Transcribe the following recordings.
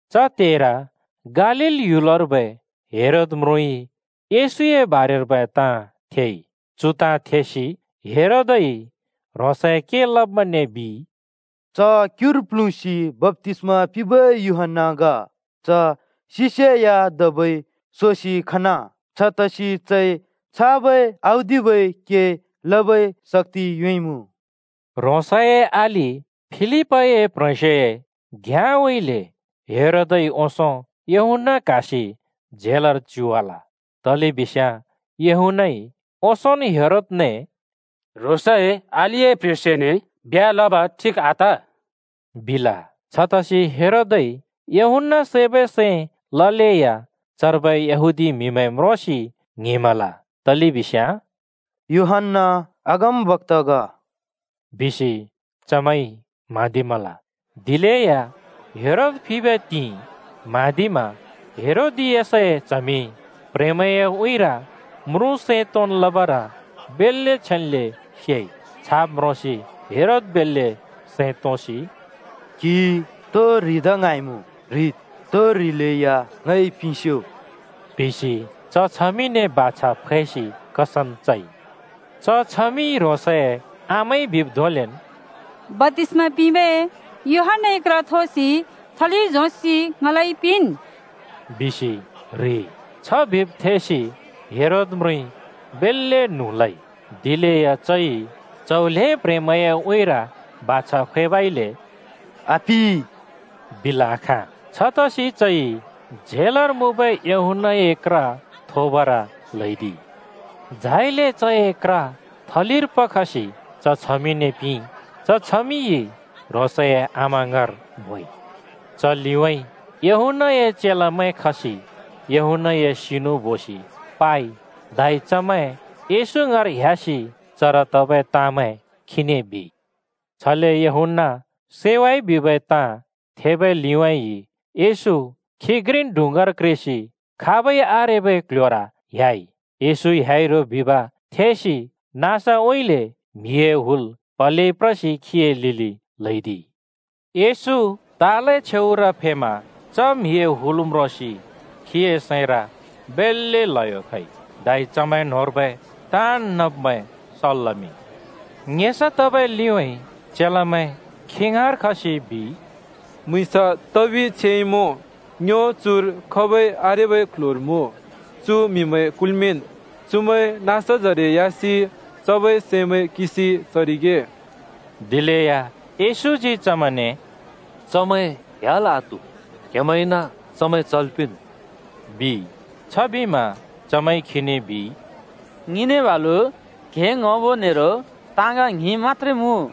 च त्हेर गालील ह्‍युलर्बै हेरोद म्रुँइ येशूए बारेर्बै ताँ थेइ। चु ताँ थेसि हेरोदइ ह्रोंसए के लब्मैंने बिइ, “च क्‍युर प्‍ल्हुँसि बप्‍तिस्‍मा पिंबै यूहन्‍ना ग। च सिसेया धबै सोसि खना। छतसि चइ छाबै औदिबै के लबै शक्‍ति योंइमुँ।” ह्रोंसए अलि फिलिपए प्ह्रेंस्योए घ्याँउँइँले हेरोदइ ओंसों यूहन्‍ना क्हासि झेलर च्युवाल। तलेबिस्याँ यूहन्‍नाइ ओंसोंन् हेरोदने “ह्रोंसए अलिए प्ह्रेंस्योने ब्ह्‍या लब ठिक आत,” बिल। छतसि हेरोदइ यूहन्‍ना सैबै सैं ललेया चर्बै यहूदी म्हिमैं म्रोंसि ङ्हिंमल। तलेबिस्याँ “यूहन्‍ना अगमबक्‍ता ग,” बिसि चमैंइ म्हाँदिमल। दिलेया हेरोद फिबै त्हिंइ म्हाँदिमा हेरोदियासए च्हमि प्‍ह्रेंमैंए उँइँर म्रुँ सैं तोंन् लबर बेल्‍ले छेन्‍ले सेइ। छाब् म्रोंसि हेरोद बेल्‍ले सैं तोंसि “क्‍हिइ तो ह्रिदा ङ्हाँइमुँ ह्रिद्, तो ह्रिलेया ङइ पिंस्‍यो,” बिसि च छमिंने बाछा फैसि कसम चइ। च छमिइ ह्रोंसए आमाइ बिब् धोंलेन् “बप्‍तिस्‍मा पिंबै यूहन्‍नाए क्र थोसि थलिर झोंसि ङलाइ पिंन्,” बिसि ह्रिइ। छ बिब् थेसि हेरोद म्रुँइ बेल्‍ले न्हुँ लइ, दिलेया चइ च्‍हौ ल्‍हें प्‍ह्रेंमैंए उँइँर बाछा फैबइले “आपिं” बिल् आखाँ। छतसि चइ झेलर मुँबै यूहन्‍नाए क्र थोबर ल्हैदिइ। झाइले चए क्र थलिर पखसि च छमिंने पिंइ। च छमिंइ ह्रोंसए आमा ङाँर बोइ। च लिउँइँ यूहन्‍नाए चेलामैं खसि यूहन्‍नाए सिनु बोसि पाइ। धै चमैं येशू ङाँर ह्‍यासि चर तबै ताँमैं खीने बिइ। छले यूहन्‍ना सैवाइ बिबै ताँ थेबै लिउँइँ येशू खी घ्रिन् डुँङ्गार क्रेसि खाबै आरेबै क्‍ल्‍ह्‍योर ह्‍याइ। येशू ह्‍याइ रो बिब् थेसि नाँसउँइँले म्‍हिए हुल प्हलेइ प्रसि खीए लिलि ल्‍हैदिइ। येशू तालए छेउर फेमा च म्हिए हुल म्रोंसि खीए सैंर बेल्‍ले ल्हयो खइ। धै चमैं न्‍होंर्बै ताँन् नब्मैं सल् लमिंइ। ङेसा तबै लिउँइँ चेलामैं खी ङाँर खसि बिइ, “म्‍हुँइँस तबि छेइमुँ। ङ्यो चुर खाबै आरेबै क्‍ल्‍ह्‍योर मुँ। चु म्‍हिमैं कुल्मिंन्। चुमैं नाँसजरे ह्‍यासि चबै सैमैं किंसि चरिगे।” दिलेया येशूजी चमैंने “चमैं ह्‍याल् आत्हु। क्हेमैंइन चमैं चल् पिंन्,” बिइ। छबिमा चमैंइ खीने बिइ, “ङिने बालु क्हें ङ्‍हबो नेरो ताँग ङ्हिं मत्‍त्रे मुँ।”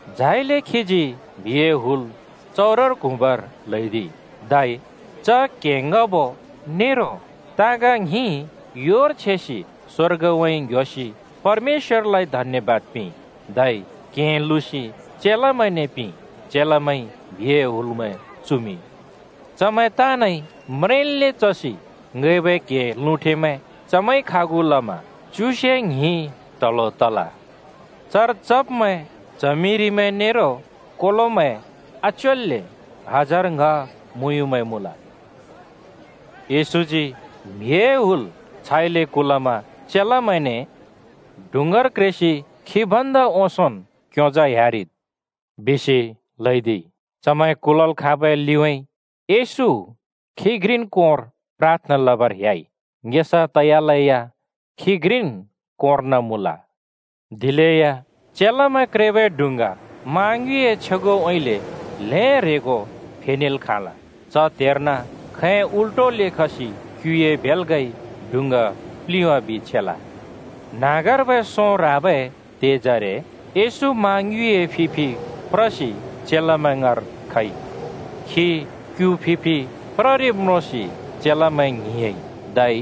झाइले खीजी म्‍हिए हुल चउरर क्हुँबर ल्‍हैदिइ। धै च क्‍हें ङ्‌हबो नेरो ताँग ङ्हिं योर छेसि स्‍वर्गउँइँ ङ्‌ह्‍योसि परमेश्‍वरलाइ धन्‍यबाद पिंइ। धै क्‍हें लुँसि चेलामैंने पिंइ। चेलामैंइ म्‍हिए हुलमैं चुमिंइ। चमैं ताँनइ म्रेंन्ले चसि ङैबै क्हें लुँठेमैं चमैंइ खागु लमा च्युसे ङ्हिं ट्हलो तल। चर चब्मैं च्हमिरिमैं नेरो कोलोमैं आच्योल्‍ले हजार ङ्‌ह मुँयुँमैं मुँल। येशूजी म्हिए हुल छाइले कुलमा चेलामैंने “डुँङ्गार क्रेसि ङ भन्दा ओंसों क्‍योंजा ह्‍यारिद्,” बिसि ल्हैदिइ। चमैं कुलल् खाँबै लिउँइँ येशू खी घ्रिन् कोंर प्राथना लबर ह्‍याइ। ङेसा तयालेया खी घ्रिन् कोंर्न मुँल। दिलेया चेलामैं क्रेबै डुँङ्गा मा ङ्युँइए छ्योगउँइँले ल्हें ह्रेंगो फेनेल् खाँल। च त्हेर्न खैं उल्टोले खसि क्‍युए भेल्‍गाइ डुँङ्गा प्लिंवाबि छेल। न्‍हाँगर्बै सों ह्राबै त्हेजरे येशू मा ङ्युँइए फि फि प्रसि चेलामैं ङाँर खइ। खी क्‍यु फि फि प्ररिब् म्रोंसि चेलामैं ङ्हिंयाँइ, धै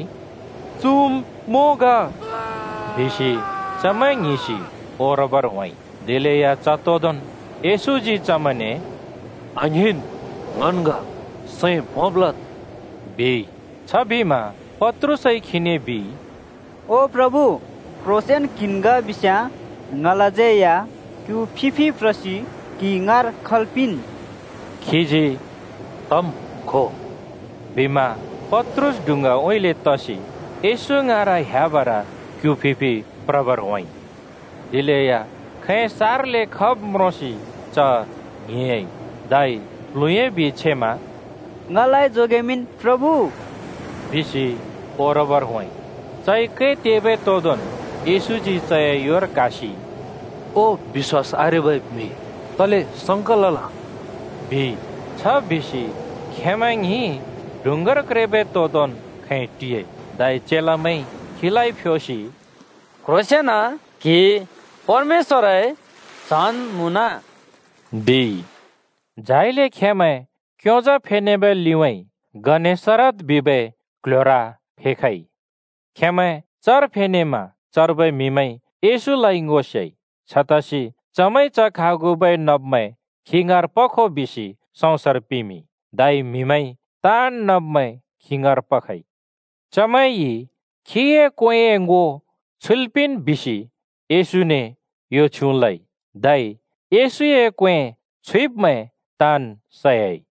“चुम् मों ग,” बिसि चमैं ङ्हिंसि ओरबर होंइ। दिलेया च तोदोंन् येशूजी चमैंने “आङ्हिंन्, ङन् ग! सैं भोंब् लद्,” बिइ। छबिमा पत्रुसइ खीने बिइ, “ओ प्रभु, क्‍ह्रोंसेंन क्‍हिन् ग बिस्‍याँ, ङलाज्यै या क्‍यु फि फि प्रसि क्‍हि ङाँर खल् पिंन्।” खीजी “तम्, खो,” बिमा पत्रुस डुँङ्गाउँइँले तसि येशू ङाँर ह्‍याबर क्यु फि फि प्रबर होंइ। दिलेया खैं सार्लै खब् म्रोंसि च ङ्हिंयाँइ, धै प्ल्हुँह्‍याबि छेमा “ङलाइ जोगेमिंन्, प्रभु,” बिसि ओबर होंइ। चइ कै तेबै तोदोंन् येशूजी चए योर क्‍हासि “ओ बिश्‍वास आरेबै म्हि, तले संका लल?” बिइ। छ बिसि खेंमैं ङ्हिं डुँङ्गार क्रेबै तोदोंन् खैं टियाइ। धै चेलामैंइ खीलाइ फ्योसि “क्‍ह्रोंसेंन क्‍हि परमेश्‍वरए च्‍हन् मुँन,” बिइ। झाइले खेंमैं क्‍योंजा फेनेबै लिउँइँ गनेसरत बिबै क्‍ल्‍ह्‍योर फेखइ। खेंमैं चर फेनेमा चर्बै म्‍हिमैंइ येशूलाइ ङो सेइ। छतसि चमैंइ च खागुबै नब्मैं खी ङाँर पखो बिसि सँउँसर पिमिंइ। धै म्हिमैंइ ताँन् नब्मैं खी ङाँर पखइ। चमैंइ खीए क्वेंए ङो छुइल् पिंन् बिसि येशूने यो छ्युँ लइ, धै येशूए क्‍वें छुइब्मैं ताँन् सयाइ।